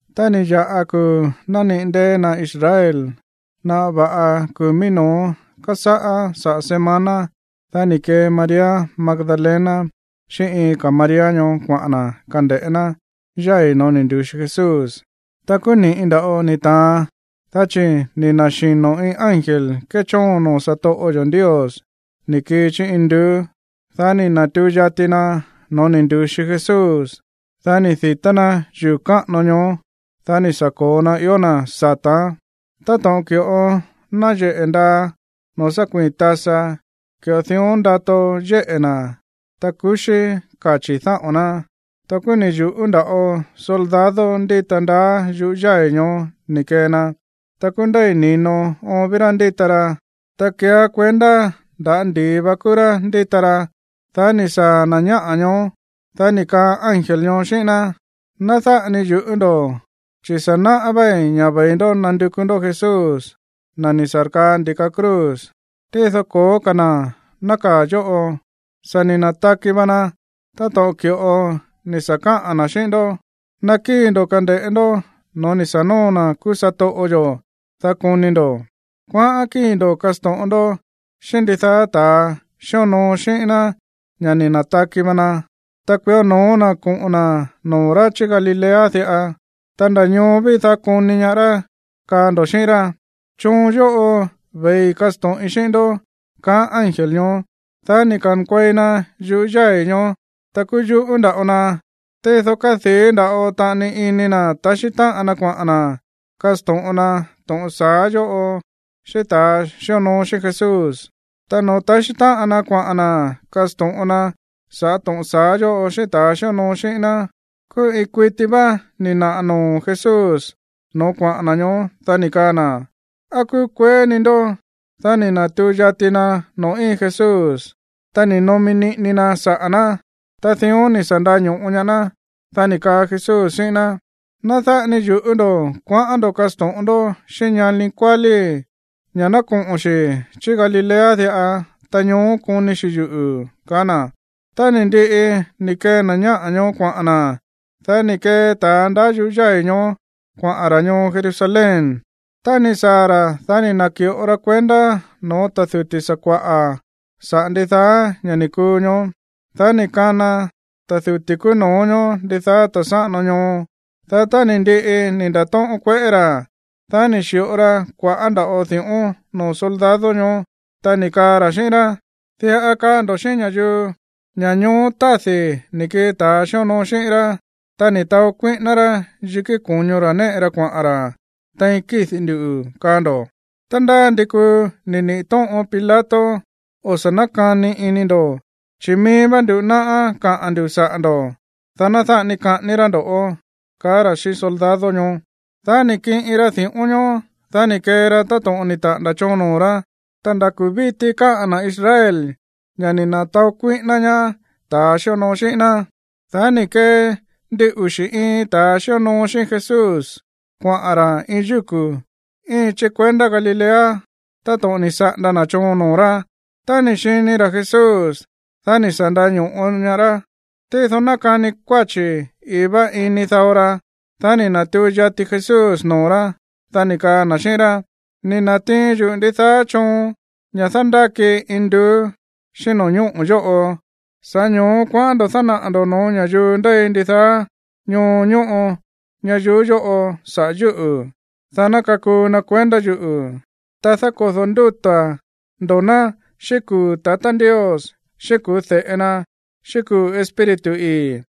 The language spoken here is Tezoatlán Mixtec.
Tá ni̱ ya̱ꞌa kuu̱ nániꞌi̱ ndée̱ na̱ Israel, naꞌa va̱ꞌa kuu̱ mií no̱ó kásáꞌá saꞌa̱ semana, dá ni̱ kee María Magdalena xíꞌín iin ka̱ María ñoó kuaꞌa̱n na̱ kande̱ꞌé ná yái̱ no̱ó ni̱ ndu̱xi Jesús. Ta kúú ni̱ꞌi nda̱ꞌo ni̱ ta̱an, dá chi̱ ni̱ na̱xino̱ iin ángel kéchóon noo̱ satoꞌo yo̱ Ndios ni̱ kii chí induú, dá ni̱ na̱tuu yati na no̱ó ni̱ ndu̱xi Jesús, dá ni̱ di̱tá ná yuu̱ káꞌano ñoó, dá ni̱ sa̱ ko̱o na ió na̱ sata̱án. Táto̱ꞌon ki̱ꞌo náyeꞌe̱ ndaa noo̱ sá kuii̱n tasa, ki̱ꞌo dión ndato yéꞌe̱ na̱, ta kuxí kachi̱ dáꞌo̱n ná. Ta kúú ni̱ yu̱ꞌú nda̱ꞌo soldado ndíta ndaá yuꞌú yái̱ ñoó ni̱ kee na, ta kúú ndéi̱ ni̱no oon ví rá ndíta ra, ta kéeá kuendá nda̱á ndi̱i va kúú rá ndíta ra. Dá tá ni̱ saa̱ na̱ ñáꞌa̱ ñoó, dá ni̱ kaa ángel ñoó xíꞌín ná: ―Ná dáꞌa ni yu̱ꞌú ndo̱, chi̱ sa̱ náꞌá váí ña̱ ve̱i ndó nándukú ndó Jesús, na̱ ni̱ sa̱rkaa ndi̱ka cruz. Tído ko̱ó ka̱ na̱ nákaa̱ yóꞌo. Sa̱ ni̱ na̱taki va na táto̱ꞌon ki̱ꞌo ni̱ sa̱ káꞌa̱n na̱ xíꞌín ndó. Nakíi̱ ndo̱ kande̱ꞌé ndó no̱ó ni̱ sa̱ nóo na̱ kúú satoꞌo yo̱, dá koni ndo̱. Kuaꞌán kíi̱ ndo̱ kasto̱ꞌon ndó xíꞌín ndidaá ta̱a xíonoo xíꞌín ná ña̱ ni̱ na̱taki va na. Ta kuió no̱ó na̱ koꞌo̱n na̱ noo̱ rá chí Galilea diꞌa. Ta nda̱ ñoó ví, dá koni ñaá rá, kaa ndo̱ xíꞌín rá. Choon yóꞌo ve̱i kasto̱ꞌin xíꞌín ndó ―kaá ángel ñoó. Dá ni̱ ka̱nkuei na yuꞌú yái̱ ñoó, ta kúú yuꞌú nda̱ꞌo na. Tído kádii̱ nda̱ꞌo taꞌani ini na̱ taxí táꞌan na kuaꞌa̱n na̱ kasto̱ꞌon na to̱ꞌon sa̱á yóꞌo xíꞌín ta̱ xíonoo xíꞌín Jesús. Ta noo̱ taxí táꞌan na kuaꞌa̱n na̱ kasto̱ꞌon na saꞌa̱ to̱ꞌon sa̱á yóꞌo xíꞌín ta̱ xíonoo xíꞌín ná, kúú iin kuití vá ni̱ naꞌa̱ noo̱ Jesús no̱ó kuaꞌa̱n na̱ ñoó, dá ni̱ kaa na̱: ―¿Á kúkueé ni ndó? Dá ni̱ na̱tuu yati na noo̱ íin Jesús, ta ni̱ nomi niꞌini na saꞌa̱ ná, ta dión ni̱ sa̱ nda̱ño̱ꞌo ñaá ná. Dá ni̱ kaa Jesús xíꞌín ná: ―Ná dáꞌa ni yu̱ꞌú ndo̱. Kuaꞌán ndo̱ kasto̱ꞌon ndó xíꞌín ñani kuálíi̱ ña̱ ná koꞌo̱n xi̱ chí Galilea diꞌa, ta ñoó koni xi̱ yuꞌu̱ ―kaá na̱. Tá ni̱ ndiꞌi ni̱ kee na̱ ñáꞌa̱ ñoó kuaꞌa̱n na̱, dá ni̱ kee ta̱ ndaá yuꞌú yái̱ ñoó kuaꞌa̱n ra̱ ñoo Jerusalén. Tá ni̱ saa̱ ra̱, dá ni̱ na̱ki̱ꞌo ra kuendá no̱ó ta̱ duti̱ sakua̱ꞌa̱ saꞌa̱ ndidaá ña̱ ni̱ kuu ñoó. Dá ni̱ kana ta̱ duti̱ kúú no̱ó ñoó ndidaá ta̱ sáꞌano ñoo. Dá tá ni̱ ndiꞌi ni̱ nda̱tóꞌón kueꞌé ra̱, dá ni̱ xi̱ꞌo ra kua̱ꞌá nda̱ꞌo di̱ꞌón noo̱ soldado ñoó, ta ni̱ kaa ra̱ xíꞌín rá: ―Kaa ndo̱ xíꞌín ña̱yuu ña̱ ñoó tádi̱ ni̱ kii ta̱ sa̱ xi̱onoo xíꞌín rá, ta ni̱ taó kuíꞌíná rá yikí ko̱ño ra̱ néꞌe ra kuaꞌa̱n ra̱ tein kídi̱ ndu̱, kaa ndo̱. Tá ndá ndi kuu ni̱ niꞌi̱ tóꞌon Pilato, o̱ sa̱ nákani ini ndo̱, chi̱ mií vá ndú náꞌá káꞌa̱n ndu̱ saꞌa̱ ndo̱, dá ná dáꞌa ni kaꞌání rá ndo̱ ―kaá ra̱ xíꞌín soldado ñoó. Dá ni̱ kiꞌin ra di̱ꞌón ñoó. Dá ni̱ kee ra táto̱ꞌon ni̱ taꞌa̱nda̱ choon noo̱ rá. Ta nda̱ kuu̱ víti káꞌa̱n na̱ Israel ña̱ ni̱ na̱taó kuíꞌíná ñaá ta̱ ni̱ sa̱ xi̱onoo xíꞌín ná. Dá ni̱ kee ndin uxi̱ iin ta̱a xíonoo xíꞌín Jesús kuaꞌa̱n ra̱ iin yúku̱ íin chí kuendá Galilea táto̱ꞌon ni̱ saꞌanda na̱ choon noo̱ rá. Tá ni̱ xini ra̱ Jesús, dá ni̱ sa̱ nda̱ño̱ꞌo ñaá rá. Tído nákani kuáchi̱ ii̱ vá ini dao ra. Dá ni̱ na̱tuu yati Jesús noo̱ rá, dá ni̱ kaa na̱ xíꞌín rá: ―Ni̱ na̱tiin yuꞌu̱ ndidaá choon ña̱ dándákii induú xíꞌín no̱ñóꞌo̱ yóꞌo. Sa̱ꞌá ño̱ó kuaꞌán ndo̱ dánaꞌa̱ ndo̱ no̱ó ña̱yuu ndéi ndidaá ñoo ñóꞌo ñayuú yóꞌo saꞌa̱ yúꞌu̱, dá ná kakuu na kuendá yuꞌu̱. Ta dákodo̱ ndúta̱ ndo̱ ná xíꞌín kuu̱ tatá Ndios, xíꞌín kuu̱ de̱ꞌe na, xíꞌín kuu̱ Espíritu ii̱,